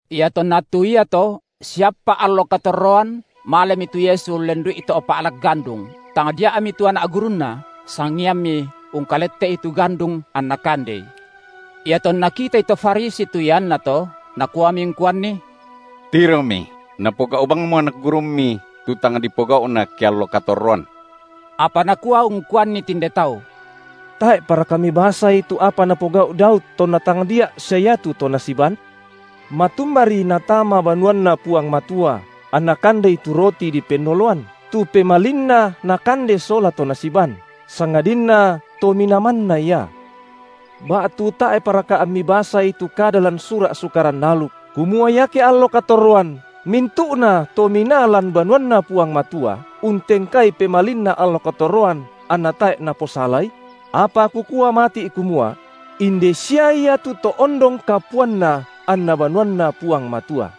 Iatonna attu iato siappa’ allo katorroan malemi tu Yesu ullendu’i to’ pa’lak gandung, tangdia’mi tu anak gurunNa, sangiammi ungkalette’i tu gandung anna kandei. Iatonna kitai to Farisi tu iannato, nakuami ungkuanNi: Tiromi, napogau’ bangmo anak gurumMi tu tang dipogau’na ke allo katorroan. Apa Nakua ungkuanni tinde tau: Tae’ paraka mibasai tu apa napogau’ Daud tonna tangdia’ sia iatu to nasiban? Matumbari natama banuanNa Puang Matua, anna kandei tu roti dipennoloan, tu pemalinna nakande sola tu to nasiban, sangadinna to minaa manna ia? Ba’tu tae’paraka ammi basai tu kada lan sura’ Sukaran aluk, kumua iake allo katorroan mintu’nato minaa lan banuanNa Puang Matua untengkai pemalinna allo katorroan anna tae’ naposalai? Apa Kukua mati’ kumua: inde sia Ia tu To ondong kapuanna anna banuanNa Puang Matua.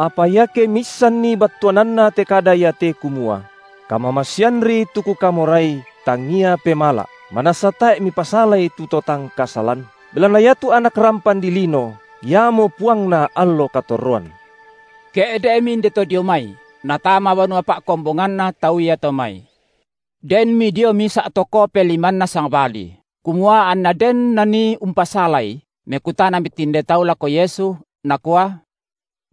Apa iake miissanmi battuananna te kada iate kumua: Kamamaseanri tu Kukamorai, tangia pemala’, manassa tae’ mipasalai tu to tang kasalan, belanna iatu Anak rampan dilino, Iamo puangna allo katorroan. Ke’de’mi inde to dio mai, Natama banua pa’kombonganna tau iato mai. Denmi dio misa’ to kope limanna sangbali; kumua anna den nanii umpasalai, mekutanami tinde tau lako Yesu, nakua: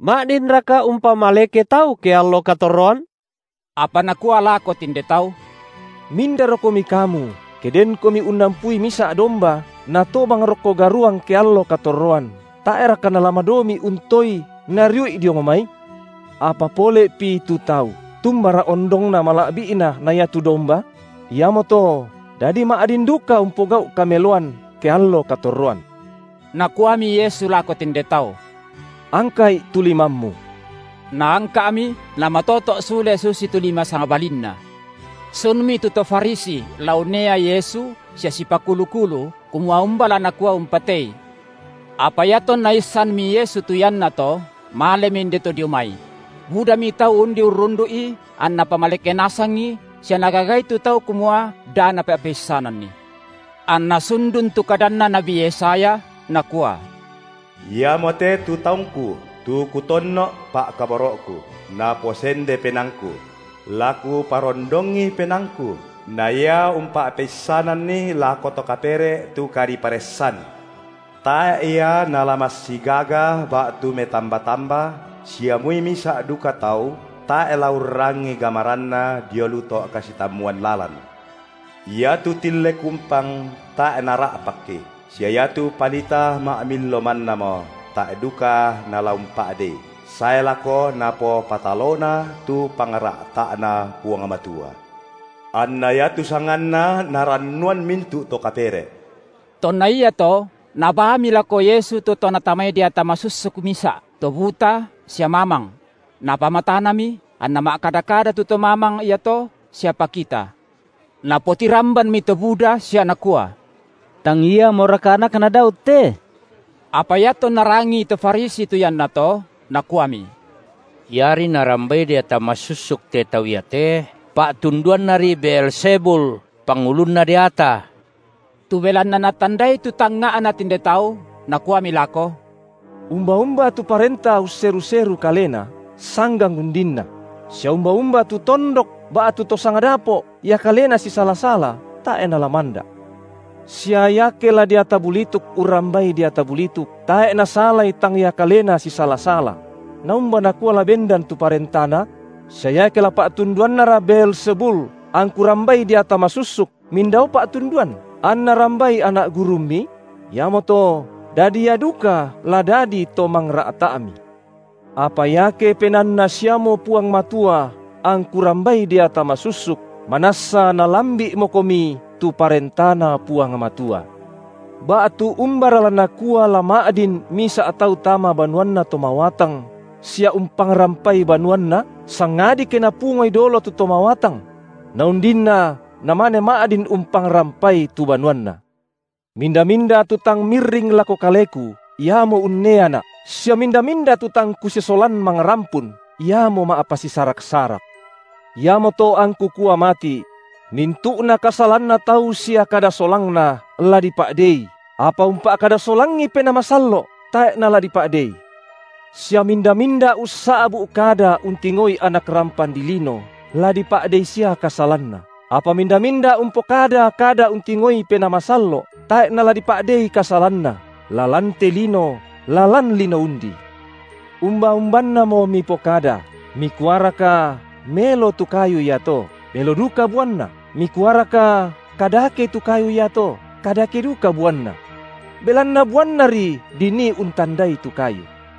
ma’dinraka umpamaleke tau, keallo katorroan? Apa Nakua lako tinde tau: Mindarokomi kamu ke denkomi unnampui misa’ domba, natobang rokko garuang ke allo katorroan, tae’raka nala madomi’ untoei nariu’i diong mai? Apa pole’pi tu tau, tumbara ondongna mala’bi’na na iatu domba? Iamoto dadi ma’din duka umpogau’ kameloan ke allo katorroan. Nakuami Yesu lako tinde tau: Angka’i tu limammu! Naangka’mi, namatoto’ sule susitu lima sangbalinna. Sunmi tu to Farisi la unnea Yesu sia sipakulu-kulu, kumua umba la nakua umpatei. Apa iatonna issanmi Yesu tu iannato, malemi inde to dio mai; budami tau undi urrundu’I anNa pamaleke nasangi, sia Nagagai tu tau kumua da napa’peissananNi. Anna sundun tu kadanna nabi Yesaya, nakua: Iamote tu taungKu, tu to Kutonno’, pa’kaboro’Ku, naposende penaangKu; la Kuparondongi PenaangKu, na Ia umpa’peissananni lako to kapere’ tu kadiparessan. Tae’ Ia nala massigaga ba’tu metamba-tamba, sia moi misa’ duka tau tae’ la urrangii gamaranNa dio lu to’ kasitammuan lalan. Iatu tille kumpang tae’ Nara’pakki, sia iatu palita ma’millo mannamo tae’ duka Nala umpa’dei, sae lako Napopatalona tu pangra’ta’Na Puang Matua. Anna iatu sanganNa narannuan mintu’ to kapere’. Tonna iato nabaami lako Yesu tu to natamai deata masussuk misa’, to buta sia mamang; Napamatanami, anna ma’kada-kada tu to mamang iato sia pakita. Napotirambanmi to buda sia nakua: Tang Iamoraka Anakna Daud te? Apa iatonna rangii to Farisi tu iannato, nakuami: Iari Naurrambai deata masussuk te tau iate, pa’tunduannari Beelzebul, pangulunna deata. Tu belanna Natandai tu tangnga’na tinde tau, Nakuami lako: Umba-umba tu parenta usseru-seru kalena, sanggang undinna; sia umba-umba tu tondok ba’tu to sangdapo’ ia kalena sisala-sala, tae’ nala manda’. Sia iake la deata bulituk urrambai deata bulituk, tae’ nasalai tang ia kalena sisala-sala; naumba nakua la bendan tu parentana? Sia iake la pa’tunduannara Beelzebul angKu rambai deata masussuk, mindao pa’tunduan, anna rambai anak gurummi? Iamoto dadi ia duka la dadi to mangra’ta’mi. Apa iake Penaanna siamo Puang Matua angKu rambai deata masussuk, manassa nalambi’mokomi tu ParentaNa Puang Matua. Ba’tu umbara la nakua la ma’din misa’ tau tama banuanna to mawatang sia umpangrampai banuanna, sangadi ke napungoi dolo tu to mawatang? Na undinna namane ma’din umpangrampai tu banuanna. Minda-minda tu tang mirring lako Kaleku, iamo unneaNa’, sia minda-minda tu tang Kusisolan mangrampun, iamo ma’pasisarak-sarak. Iamoto angKu kua mati’: Mintu’na kasalanna tau sia kada solangna, la dipa’dei, apa umpa’kada solangi Penaa Masallo’, tae’ nala dipa’ dei. Sia minda-minda ussa’bu’ kada untingoi Anak rampan dilino, la dipa’dei sia kasalanna; apa minda-minda umpokada kada untingoi Penaa Masallo’, tae’ nala dipa’dei kasalanna, la lan te lino, la lan lino undi. Umba-umbannamo mipokada, mikuaraka melo tu kayu iato, melo duka buanna, mikuaraka kadake tu kayu iato, kadake duka buanna. Belanna buannari dinii untandai tu kayu.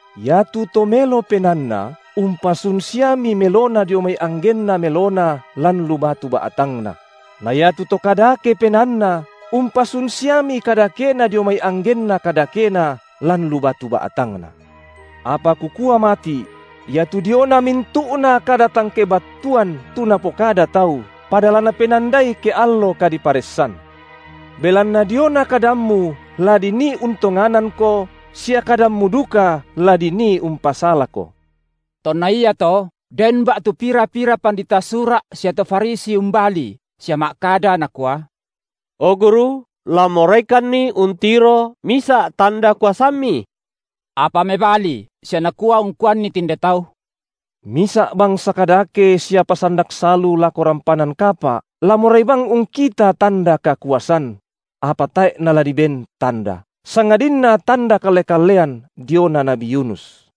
Iatu to melo penaanna umpasun siami melona dio mai anggenna melona lan lu batu ba’tangna; na iatu to kadake penaanna umpasun siami kadakena dio mai anggenna kadakena lan lu batu ba’tangna. Apa Kukua mati’: Iatu diona mintu’na kada tang kebattuan, tu napokada tau, pada la napenandai ke allo kadiparessan. Belanna diona kadammu la dinii untonganangko, sia kadammu duka la dinii umpasalako. Tonna iato den ba’tu pira-pira pandita Sura’ sia to Farisi umbali sia ma’kada nakua: O Guru la moraikanni untiro misa’ tanda kuasamMi. Apa mebali sia Nakua ungkuanni tinde tau: Misa’ bangsa kadake sia pasandak salu lako rampanan kapa’ la morai bang ungkita tanda kakuasan: apa tae’ nala diben tanda, sangadinna tanda kalle-kallean diona nabi Yunus.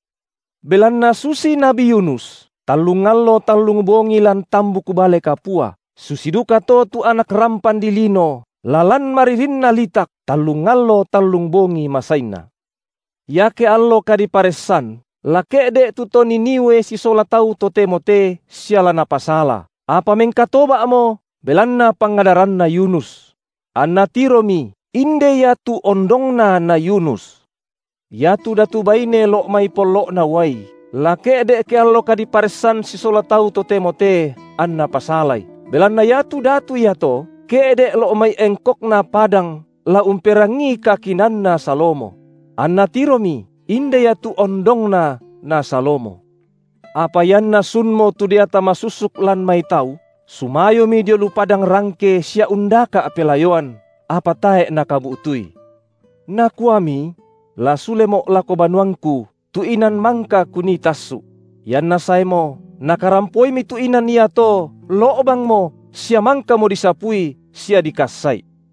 Belanna susi nabi Yunus tallung allo tallung bongi lan tambuk bale kapua, susi dukato tu Anak rampan dilino la lan maririnna litak tallung allo tallung bongi masainna. Iake allo kadiparessan la ke’de’ tu to Niniwe sisola tau totemo te sia la napasala, apa mengkatoba’mo belanna pangadaranna Yunus; anna tiromi, inde Ia tu ondongna na Yunus. Iatu datu baine lo’ mai pollo’na uai la ke’de’ ke allo kadiparessan sisola tau totemo te anna pasalai, belanna iatu datu iato ke’de’ lo’ mai engkokna padang la umperangii kakinaanna Salomo; anna tiromi: inde Ia tu ondongna na Salomo. Apa ianna sunmo tu deata masussuk lan mai tau, sumayomi dio lu padang rangke sia undaka’ pelayoan, apa tae’ nakabu’tui. Nakuami: La sulemo’ lako banuangku, tu inan mangka kunii tassu’; ianna saemo, nakarampoimi tu inan iato lo’bangmo sia mangkamo disapui sia dikassa’i.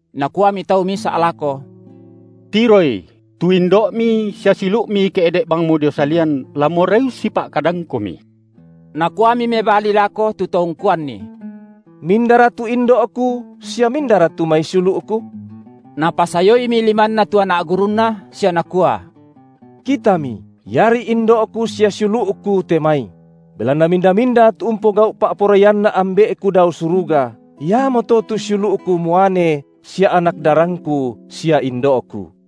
Nakuami tau misa’ lako: Tiroi, tu indo’Mi sua siulu’Mi ke’de’ bangmo dio salian, la morai ussipa’kadangKomi. Nakuami mebali lako tu to ungkuanNi: Mindara tu indo’Ku sia mindara tu mai siulu’Ku? Napasayoimi limanNa tu anak gurunNa sia Nakua: Kitami, iari indo’Ku sia siulu’Ku te mai! Belanna minda-minda tu umpogau’ pa’poraianNa Ambe’Ku dao suruga, iamoto tu siulu’Ku muane sia anak darangKu sia indo’Ku.